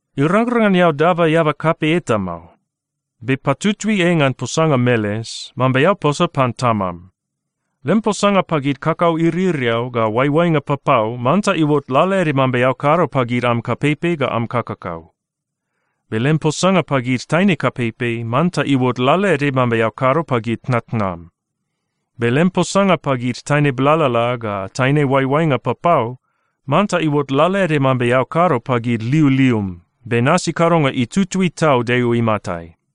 Irangrang ngan eao daba eaba kapei eta mao. Be patutui ei ngan posanga meles, mambe eao posa pan tamam. Lem posanga pagid kakau iririau ga oaioainga papau manta iuot lalaede mambe eao kado pagid am kapeipei ga am kakakau. Be lem posanga pagid taine kapeipei manta iuot lalaede mambe eao kado pagid tnatnam. Be lem posanga pagid taine blalala ga taine oaioainga papau, manta iuot lalaede mambe eao kado pagid liulium, be nasi kadonga itutui tau Deo imatai.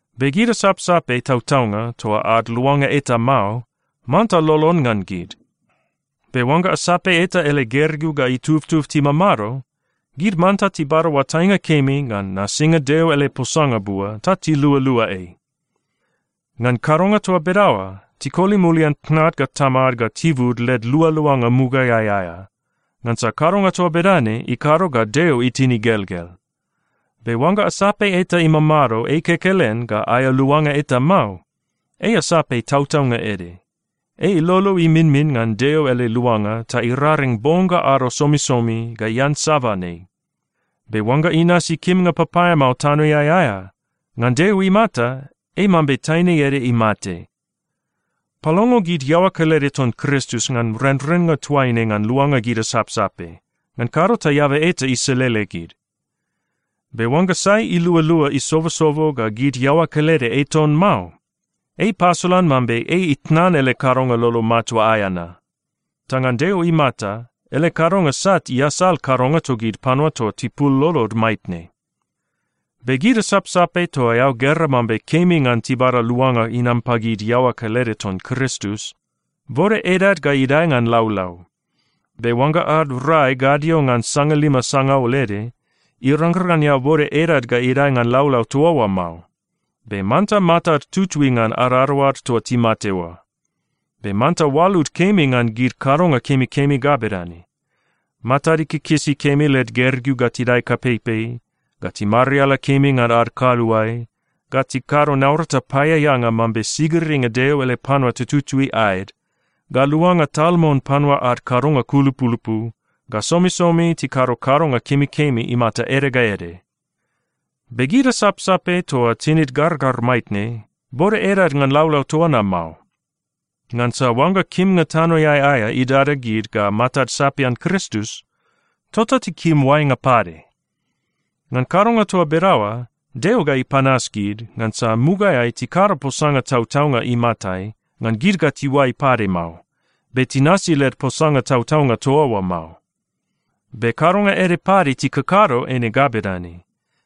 Be gid asapsape tautaunga toa ad luanga eta mao, manta lolon ngan gid. Be oangga asape eta ele gergeu ga itubtub timamado, gid manta tibada oatainga kemi ngan nasinga Deo ele posanga bua ta tilualua ei. Ngan kadonga toa bedaoa, tikoli mulian tnad ga tamad ga tibud led lualuanga mugaeai aea, ngansa kadonga toa bedane ikado ga Deo itin igelgel. Be oangga asape eta imamado ei kekelen ga aea luanga eta mao, ei asape tautaunga ede. Ei ilolo iminmin ngan Deo ele luanga ta iraring bong ga ado somisomi ga iansaban ei. Be oangga inasi kimnga papaeamao tanoeai aea, ngan Deo imata, ei mambe taine ede imate. Palongo gid iaoa kelede ton Kristus ngan renrennga toaine ngan luanga gid asapsape. Ngan kado ta eaba eta iselele gid. Be oangga sai ilualua isobosobo ga gid iaoa kelede ei ton mao, ei ipasolan mambe ei itnan ele kadonga lolo matua aea na. Ta ngan Deo imata, ele kadonga sat iasal kadonga togid panua toa tipul lolod maitne. Be gid asapsape toa eao gera mambe kemi ngan tibada luanga inam pagid iaoa kelede ton Kristus, bode edad ga idae ngan laulau. Be oangga ad rai gadio ngan sangalima sangaul ede, irangrang ngan eao bode edad ga idae ngan laulau toa oa mao. Be manta matad tutui ngan adadaoad toa timate oa. Be manta oalud kemi ngan gid kadonga kemikemi ga bedane: matad ikikisi kemi led gergeu ga tidae kapeipei, ga timariala kemi ngan ad kaluae, ga tikado naurata paeaeanga mambe sigiringa Deo ele panua tututui aed, ga luanga tal mon panua ad kadonga kulupulupu, ga somisomi tikado kadonga kemikemi imata ede ga ede. Be gid asapsape toa tinid gargar maitne, bode edad ngan laulau toa na mao. Ngansa oangga kimnga tanoeai aea idada gid ga matad sapian Kristus, tota tikim oainga pade. Ngan kadonga toa bedaoa, Deo ga ipanas gid, ngansa mugaeai tikado posanga tautaunga imatai, ngan gid ga tiuai pade mao, be tinasi led posanga tautaunga toa oa mao. Be kadonga ede pade tikakado eine ga bedane: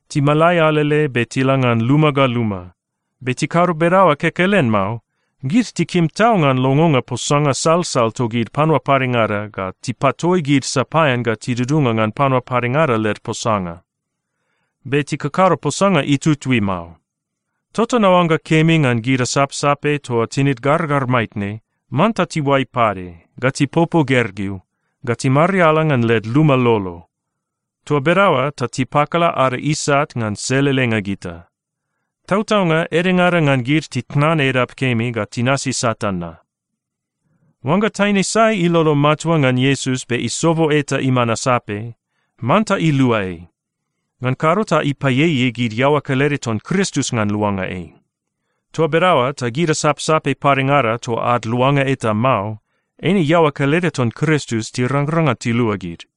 Timalai alele be tila ngan luma ga luma. Be tikado bedaoa kekelen mao, gid tikim tau ngan longonga posanga salsal togid panua padengada ga tipatoi gid sapaean ga tidudunga ngan panua padengada led posanga. Be tikakado posanga itutui mao. Tota naoangga kemi ngan gid asapsape toa tinid gargar maitne, manta tiuai pade, ga tipopo gergeu, ga timariala ngan led luma lolo. Toa bedaoa ta tipakala ada isat ngan selelenga gita. Tautaunga, edengada ngan gid titnan edap kemi ga tinasi Satan na. Oangga taine sai ilolo matua ngan Iesus be isobo eta iman asape, manta ilua ei. Ngan kado ta ipaieiei gid iaoa kelede ton Kristus ngan luanga ei. Toa bedaoa ta gid asapsape padengada toa ad luanga eta mao, eine iaoa kelede ton Kristus tirangrang ngan tilua gid.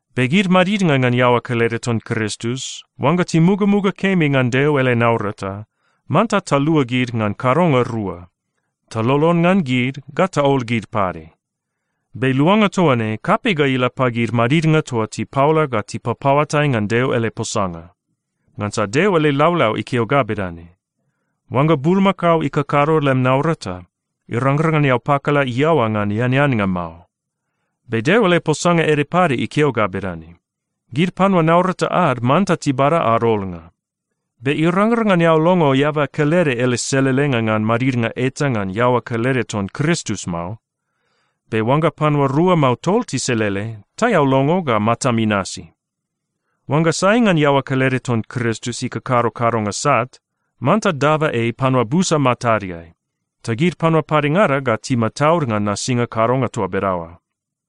Be gid madidnga ngan iaoa kelede ton Kristus, oangga timugamuga kemi ngan Deo ele naurata, manta talua gid ngan kadonga rua: Talolon ngan gid ga taol gid pade. Be luanga toa ne, kapei ga ila pagid madidnga toa tipaola ga tipapaoatai ngan Deo ele posanga. Ngansa Deo ele laulau ikeo ga bedane, “Oangga bulmakao ikakado lem naurata, irangrang ngan eao pakala iaoa ngan eaneannga mao.” Be Deo ele posanga ede pade ikeo ga bedane, “Gid panua naurata ad manta tibada ad ololnga.” Be irangrang ngan eao longo eaba kelede ele selelenga ngan madidnga eta ngan iaoa kelede ton Kristus mao. Be oangga panua rua mao tol tiselele, ta eao longo ga matam inasi. Oangga sai ngan iaoa kelede ton Kristus ikakado kadonga sat, manta daba ei panua busa matadeai, ta gid panua padengada ga timataud ngan nasinga kadonga toa bedaoa.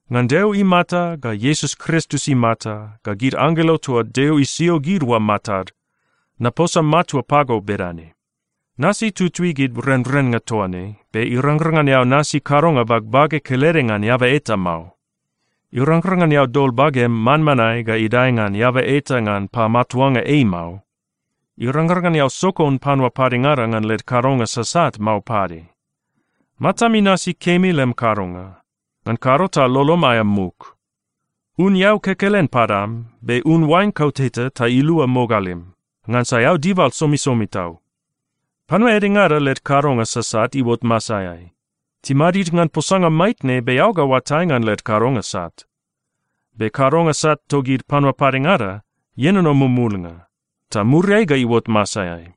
Ngan Deo imata ga Iesus Kristus imata ga gid anggelo toa Deo isio gid oa matad, naposa matua pago bedane: Nasi tutui gid renrennga toa ne, be irangrang ngan eao nasi kadonga bagbage kelede ngan eaba eta mao. Irangrang ngan eao dol bagem manmanae ga idae ngan eaba eta ngan pamatuanga ei mao. Irangrang ngan eao sokon panua padengada ngan led kadonga sasat mao pade. Matam inasi kemi lem kadonga, ngan kado ta lolom aea muk. Un eau kekelen padam, be un oain kauteta ta ilua mogalim, ngansa eao dibal somisomi tau. Panua edengada led kadonga sasat iuot masaeai. Timadid ngan posanga maitne, be eao ga oatai ngan led kadonga sat. Be kadonga sat togid panua padengada ienono mumulnga, ta muriai ga iuot masaeai.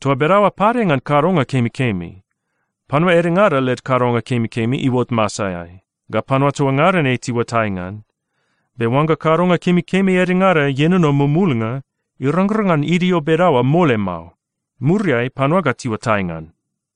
Toa bedaoa pade ngan kadonga kemikemi. Panua edengada led kadonga kemikemi iuot masaeai, ga panua toa ngada ne tiuatai ngan. Be oangga kadonga kemikemi edengada ienono mumulnga, irangrang ngan idio bedaoa mole mao. Muriai panua ga tiuatai ngan.